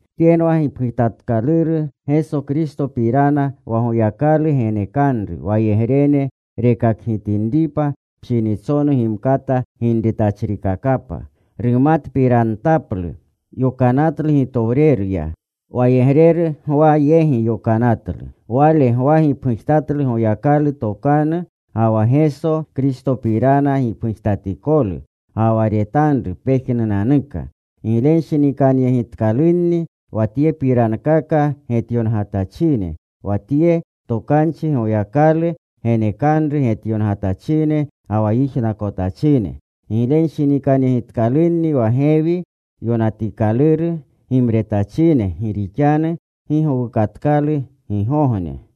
Tyenwa Gipgujetkaluru Geso Kristopirana wa Goyakalu genekanru, wayegrene rekakgitinripa pshinitsonu gimkata ginretachrikakapa, rumatkakpirantaplu. Yokanatlu gitowreruya. Wayegreru Gwa yegi yokanatlu. Wale Gwa gipgujtatlu Goyakalu tokanu ga wa Geso Kristopirana gipgujtatikolu, ga wa retanru pejnunanuka. Giglenshinikanyegitkalunni wa tyepirankaka getyongatachine, wa tye tokanchi Goyakalu genekanru getyongatachine ga wa yijnakotachine. Giglenshinikanyegitkalunni wa gewi yonatikaluru gimretachine, gi rixanu gi gowukatkalu gigogne.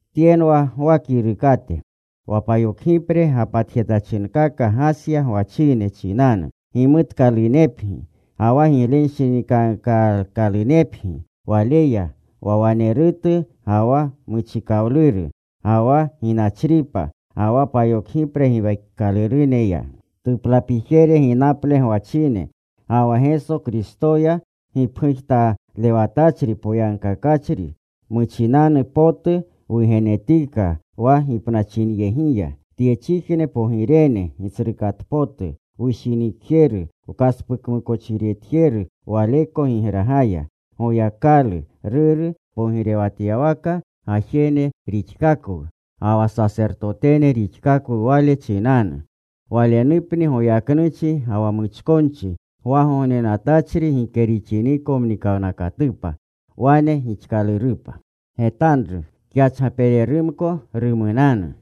Tyenwa Gwa kirukate. Wa payokgipre gapatjetyachinkaka Gasya gwachine chinanu. Gimutkalunepgi, ga wa giglewanshinikankaakalunepgi Waleya, wa wanerutu, ga wa muchikawluru, ga wa ginachripa, ga wa payokgipre giwekikaluruneya, tuplapijere ginaple gwachine. Ga wa Geso Kristoya gipgujtalewatachri poyagkakachri, muchinanu potu wugenetika wa gipnachinyegiya, tyechijne pogirene Gitsrukatpotu, wushinikjeru, wkaspukmukochiretjeru Waleko gigragaya. Goyakalu, Ruru, pogirewatyawaka gajene rixkakwu, ga wa sasertotene rixkakwu Wale chinanu. Walenupni goyaknuchi ga wa muchkonchi gwagognenatachri gike rixiniko mnikawnakatupa. Wane gixkalurupa. Getanru. Kyachgapererumko rumunanu.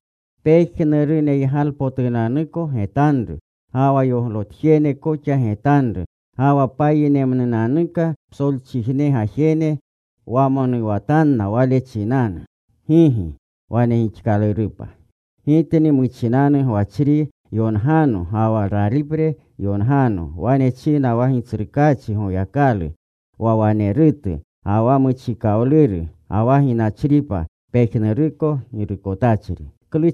Pejnuruneygalepotunanuko getanru, ga wa yoglotjene koxa getanru. Ga wa payinerumnunanuka psolchijneko gajene wamonuwatanna Wale chinanu. Gigi. Wane gixkalurupa. “Gitni wa muchinanu gwachri yongano ga wa ralipre yongano.” Wane china wa Gitsrukaachi Goyakalu, wa wanerutu, ga wa muchikawluru, ga wa ginachripa, pejnuruko Girukotachri.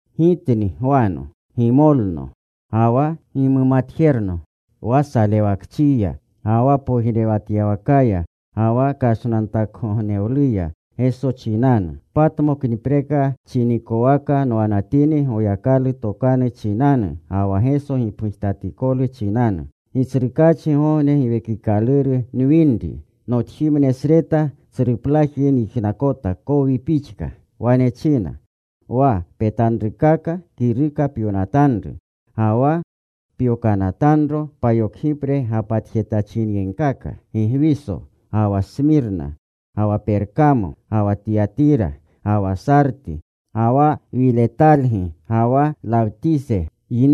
Gitni, Gwano, gimolno, ga wa gimumatjerno wa salewakchiya ga wa pogirewatyawa kaya, ga wa kashnantakgognewluya Geso chinanu. Patmoknipreka chinikowaka nwanatini Goyakalu tokanu chinanu ga wa Geso gipgujtatikolu chinanu. Gitsrukaachigogne Giwekikaluru nwini. Notjimnesreta tsruplaji nyijnakota kowi pixka. Wane china, “Wa petanrukaka kiruka pyonatanru. Ga wa pyokanatanro payokgipre gapatjetyachinyegkaka: Gigwiso, ga wa Smirna, ga wa Perkamo, ga wa Tiyatira, ga wa Sarti, ga wa Wilatelgi, ga wa Lawtise.”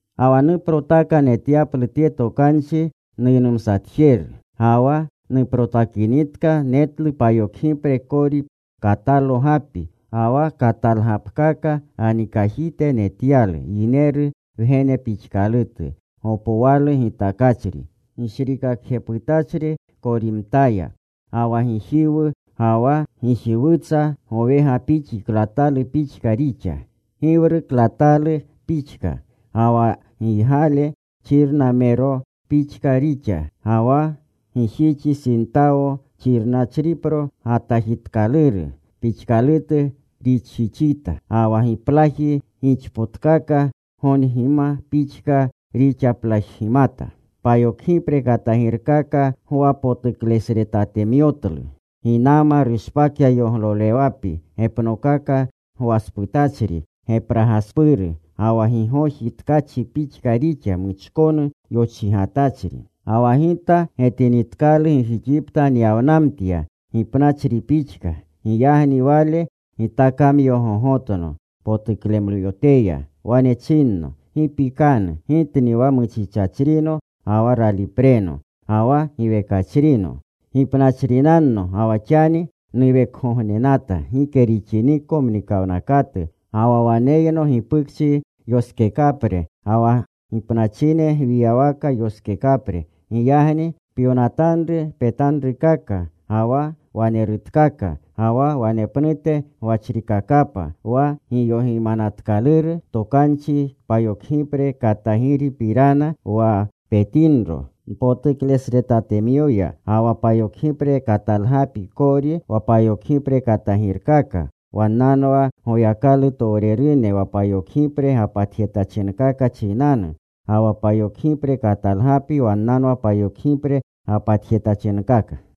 Ga wa nuprotaka netyaplu tye tokanchi nuynumsatjeru. Ga wa nuprotakinitka netlu payokgipre kori katalo gapi. Ga wa katalgapkaka ganikajite netyalu Yineru Wgene pixkalutu, gopwalu gitakachri, gishrikakjeputachri korimtaya. Ga wa gijiwu ga wa gijiwutsa gowegapixi klatalu pixka rixa, giwru klatalu pixka. Ga wa giygale xirnachrimero pixka rixa. Ga wa gijixi sintawo xirnachripro gatajitikaluru pixkalutu rixjixita. Ga wa giplaji gixpotkaka gongima pixka rixaplajgimata. Payokgipre katagirkaka gwapotuklesretatemyotlu. Ginama rushpakya yoglolewapi gepnokaka gwasputachri gepragaspuru. Ga wa gigoji tkachi pixka rixa, muchkonu yochigatyachri. Ga wa gita getinitkalu gijixipta nyawnamtya gipnachri pixka. Giyagni Wale gitakamyogogotno potuklemyoteya. Wane chinno, “Gi pikanu. Gitni wa muchichachrino ga wa ralipreno. Ga wa giwekachrino. Gipnachrinanno ga wa xani nuwekgognenata gike rixiniko mnikawnakatu. Ga wa waneyno gipukchi yoskekapre ga wa gipnachine gwiyawaka yoskekapre. Giyagni pyonatanru petanrukaka, ga wa wanerutkaka, ga wa wanepnute gwachrikakapa. Wa giyogimanatkaluru tokanchi payokgipre katagiripirana, wa petinro npotuklesretatemyoya, ga wa payokgipre katalgapi kori, wa payokgipre katagirkaka, wannanwa Goyakalutowrene wa payokgipre gapatjetyachinkaka chinanu. Ga wa payokgipre katalgapi wannanwa payokgipre gapatjetyachinkaka.